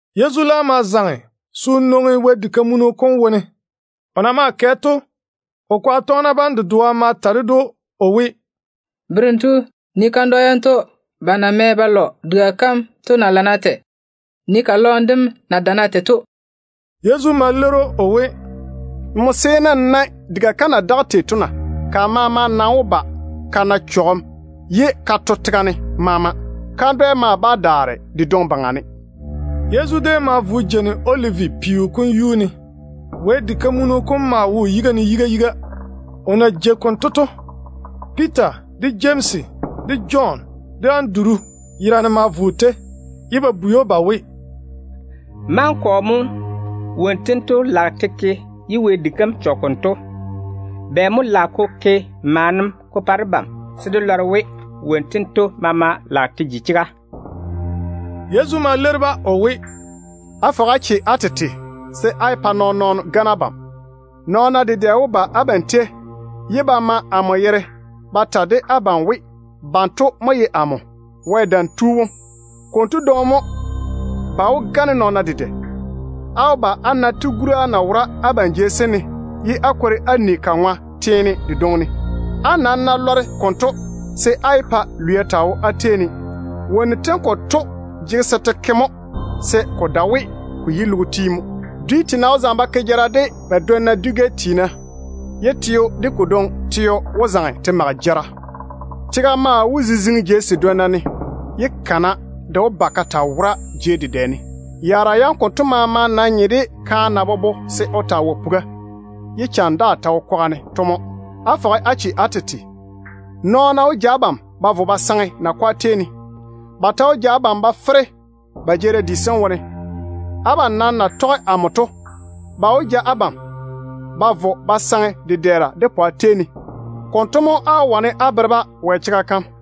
Yezu laam ma zaŋe se o nwoŋi Wɛ diga kam wone. O na maa kɛ to, o kwaga tɔgena bam dedoa ma ta ded‑o o we, “Berem tu, nii kandwa yanto ba na mɛ ba lɔ diga kam to na lana tei. Nii ka lɔɔm dem na dana tei to.” Yezu ma leiri‑o o we, “Nmo seene n nae diga kam na daga tei to na? Ka maama nam wó ba ka to ka saare tega ne. Kandwɛ daa bá daare de dwoŋi baŋa ne.” Yezu déem ma vo o jeini Olivi peo kom yuu ne. Wɛ diga kam maa wo o yiga ne yiga yiga. O na jei konto to, Piita de Jemsi de Jɔn de Anduru yerane ma vo o tei, ye ba bwei‑o ba we, “Maŋa kɔ mo wonnu tento lage te ke ye Wɛ diga kam chɔge konto? Bɛ mo lage ko ke maana ko pa debam se dé lɔre we wonnu tento maama lage te ji chega?” Yezu ma leiri-ba o we, “Fɔge-na á che á tete, se á yé pa nɔɔn-nɔɔno gane abam. Nɔɔna dedɛ wó ba abam tei ba ma amo yere ba ta de abam we, banto dedoa dedoa mo ye amo, Wɛ Dam Tu wom. Konto dwoŋi mo ba wó gane nɔɔna dedɛ. Á wó ba á na tigura na wora abam jei sem ne, ye á kwori á ni ka ŋwa teene dedwonna ne. Á nam ná lɔre konto, se á yé pa lwia taa jege abam. Wonnu tem konto jege se te ke mo, se ko dae we ko yi logo tiim mo. Logo baŋa dwi tiina wó zaŋe ba ke jara de ba dwonna dwi-gɛ tiina, ye teo de ko dwoŋi teo wó zaŋe te mage jara. Tega maa wó ziziŋi jei sedwonna ne, ye kana de wó ba ka taa wora jei dedɛ ne. Yaara yam konto maama nam nye de kaane na bobo se o taa wɔe puga, ye cham daa ta wo kwaga ne to mo. Á fɔge á che á tete. Nɔɔna wó ja abam ba vo ba saŋe nakwa tei ne. Ba ta wó ja abam ba fere ba jeerim di sem wone. Abam nam na tɔge amo to, ba wó ja abam ba vo ba saŋe dedɛɛra de pwa tei ne. Konto mo á wó na chwoŋa se á bere-ba Wɛ chega kam.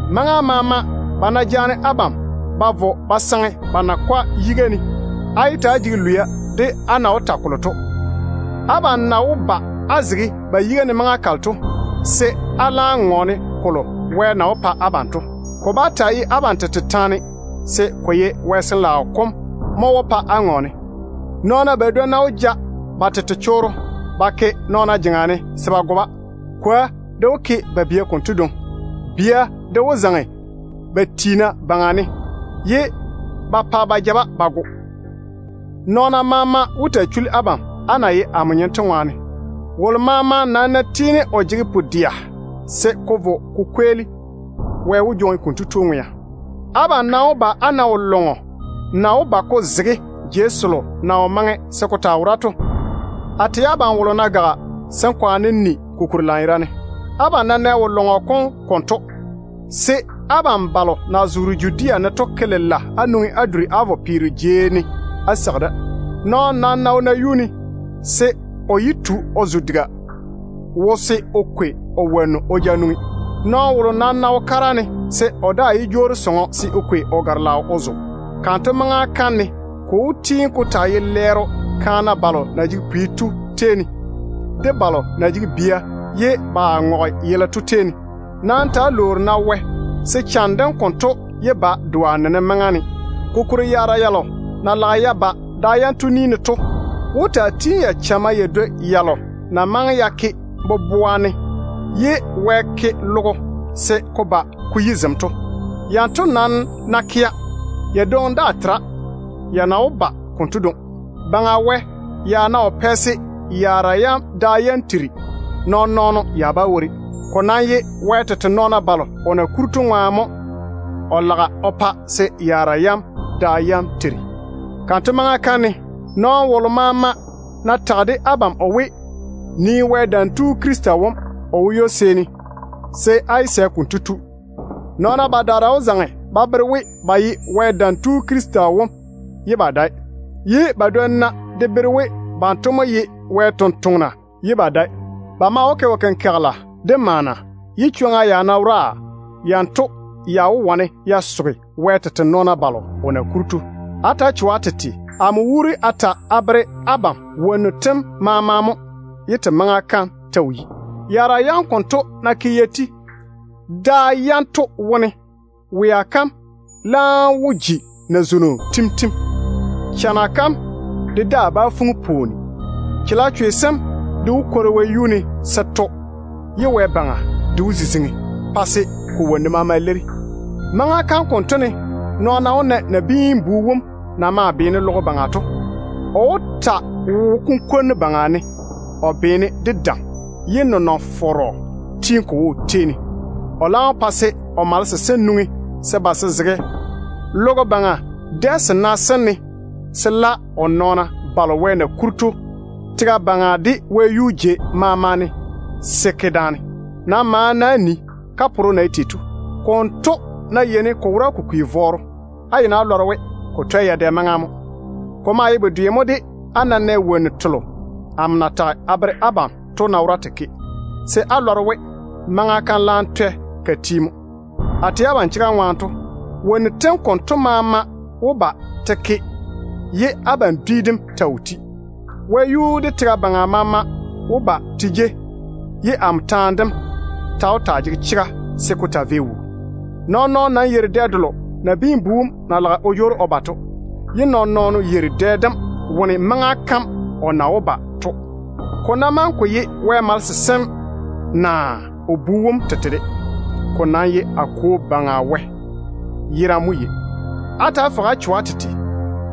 Maŋa maama ba ná jaane abam ba vo ba saŋe ba nakwa yiga ne, á yé ta‑á jege lwia de á na wó ta kolo to. Abam na wó ba á zege ba yiga ne maŋa kalo to, se á laam ŋɔɔne botare selo Wɛ na wó pa abam to. Ko bá taa ye abam tete taane, se ko ye Wɛ Sin-laao kom mo wó pa á ŋɔɔne. Nɔɔna badwonna wó ja ba tete chorro ba ke nɔɔna jeŋa ne se ba go-ba. Kwoa de wó ke ba bia konto dwoŋi. Bia de wó zaŋe ba tiina baŋa ne ye ba pa ba ja-ba ba go. Nɔɔna maama wó taa chuli abam, á na ye amo nyem to ŋwaane. Wolo maama nam ná tiini o jege pu-dɛa se ko vo ko kweeli, Wɛ wó jwoŋi konto tu ŋwea. Abam nam wó ba á na wo-zɔɔne delo na chɔge Wɛ yere to na wó ba ko zege jei selo na wo maŋe se ko taa wora to ne.” A tɛ abam wolo ná gaga, se n kwaane n ni ko kuri lanyerane. “Abam ná nɛ wo-lɔŋɔ kom konto, se abam balo na zoore Judea ne to ke lela á nwoŋi á duri á vo peero jei á seigi da. Nɔɔno nam ná wo nayuu ne, se o yé tu o zo diga wo se o kwaleme o zela o ja nwoŋi. Nɔɔno wolo nam ná wo kara ne, se o daa yé jwoori sɔŋɔ se o kwei o gare-laao o zo. Kanto maŋa kam ne ko wó tiini ko taa ye lɛɛro kaana balo na jege pwi to tei ne, de balo na jege bia ye ba ŋɔge yele to tei ne. Nam ta‑á lwoori-na Wɛ se cham dem konto yé ba doa nenem maŋa ne. Kokuri yaara yalo na lage ya ba da yanto ni ne to wó taa tiini ya chamma ya dwoi yalo na maŋe ya ke boboa ne ye Wɛ ke logo se ko ba ko yi zem to. Yanto nam ná kea, ya dwoŋi daa tera ya na wó ba konto dwoŋi. Baŋa Wɛ ya ná wo pɛ se yaara yam da yam tiri, nɔɔn-nɔɔno ya bá wori. Ko nam ye Wɛ tete nɔɔna balo o na kuri to ŋwaane mo o lage o pa se yaara yam da yam tiri. Kanto maŋa kam ne, nɔɔno wolo maama ná tage de abam o we, ‘Nii Wɛ Dam Tu Krista wom, o wo ywo-seeni’, se á yé sɛ konto tu. Nɔɔna badaara wó zaŋe ba bere we ba ye Wɛ Dam Tu Krista wom ye ba dae, ye badwonna de bere we banto mo ye Wɛ sampwori ye ba dae. Ba maa wó ke wo-kenkagela de maana, ye chwoŋa ya ná wora, yanto ya wó wane ya soge Wɛ tete nɔɔna balo o na kuri to. Ta‑á cho-na á tete. Amo wuuri a ta a bere abam wonnu tem maama mo ye te maŋa kam ta wo yi. Yaara yam konto ná ke ya ti da yanto wone, ‘Wea kam laam wó ji nazwono tim-tim. Chana kam de daa bá fuŋi pwooni. Chalechwe sem de wó kwori wɛyuu ne se to, ye wɛ-baŋa de wó ziziŋi pa se ko wonnu maama leiri.’ Maŋa kam konto ne nɔɔna wó na Nabiin-bu wom na maa beene logo baŋa to. O wó taa wo kunkwonnu baŋa ne o beena de dam, ye nenɔŋ-fɔrɔ tiini ko wo o tei ne. O laam wó pa se o malese sem nwoŋi se ba se zege logo baŋa dɛ sena sem ne se la o nɔɔna balo Wɛ na kuri tega baŋa de wɛyuu jei maama ne to se ke daane. Nam maane-na á nii kaporo na ye tei to. Konto ná yeini ko wora ko kwi vɔɔro, á yeini á lɔre we ko twɛ yadɛ maŋa mo. Ko maa ye bedwe mo de á ná nɛ wonnu telo amo na tage a bere abam to ná wora te ke, se á lɔre we maŋa kam laam twɛ ka ti mo. A tɛ abam chega ŋwaane to, wonnu tem konto maama wó ba te ke ye abam dwi dem ta wo ti. Wɛyuu de tega baŋa maama wó ba te jei, ye amo taane dem ta wó taa jege chega se ko taa vei wuu. Nɔɔn-nɔɔno nam yeiri dɛ delo Nabiin-bu wom na lage o jwoori o ba to, ye nɔɔn-nɔɔno yeiri dɛ dem wone maŋa kam o na wó ba to, ko ná maŋe ko ye Wɛ malese sem naa o Bu wom tete de. Ko nam ye amo Kwo Baŋa Wɛ yerane mo yei. Á ta‑á fɔge á cho á tete,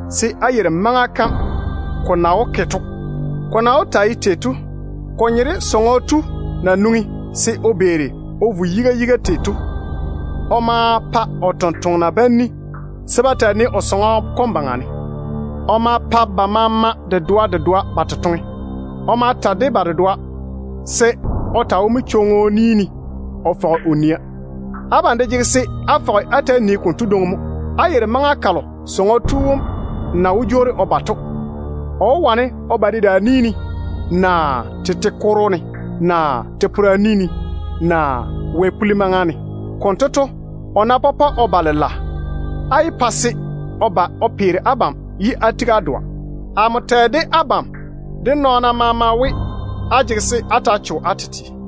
se á yeiri maŋa kam ko na wó ke to. Ko na wó taa ye tei to, ko nye de sɔŋɔ tu na nwoŋi se o beeri o vo yiga yiga tei to. O ma pa o tontoŋena bam ni se ba taa nii o sɔŋɔ kom baŋa ne. O ma pa ba maama dedoa dedoa ba totoŋe. O ma ta de ba dedoa se o taa wo manchwoŋo ni ne o fɔge o nia. Abam de jege se á fɔge á ta‑á nii konto dwoŋi mo. Á yeiri maŋa kalo sɔŋɔ tu wom na wó jwoori o ba to. O nam wó wane o ba dedaan-ni ne, naa tete kokoro ne, naa te-pora ni ne, naa wɛ-puli maŋa ne. Konto to, o ná pɔpɔ o ba lela, á yé pa se o ba o peere abam de á tigi á dɔa. Amo tɛ de abam de nɔɔna maama we, á jege se á ta‑á cho á tete mo.”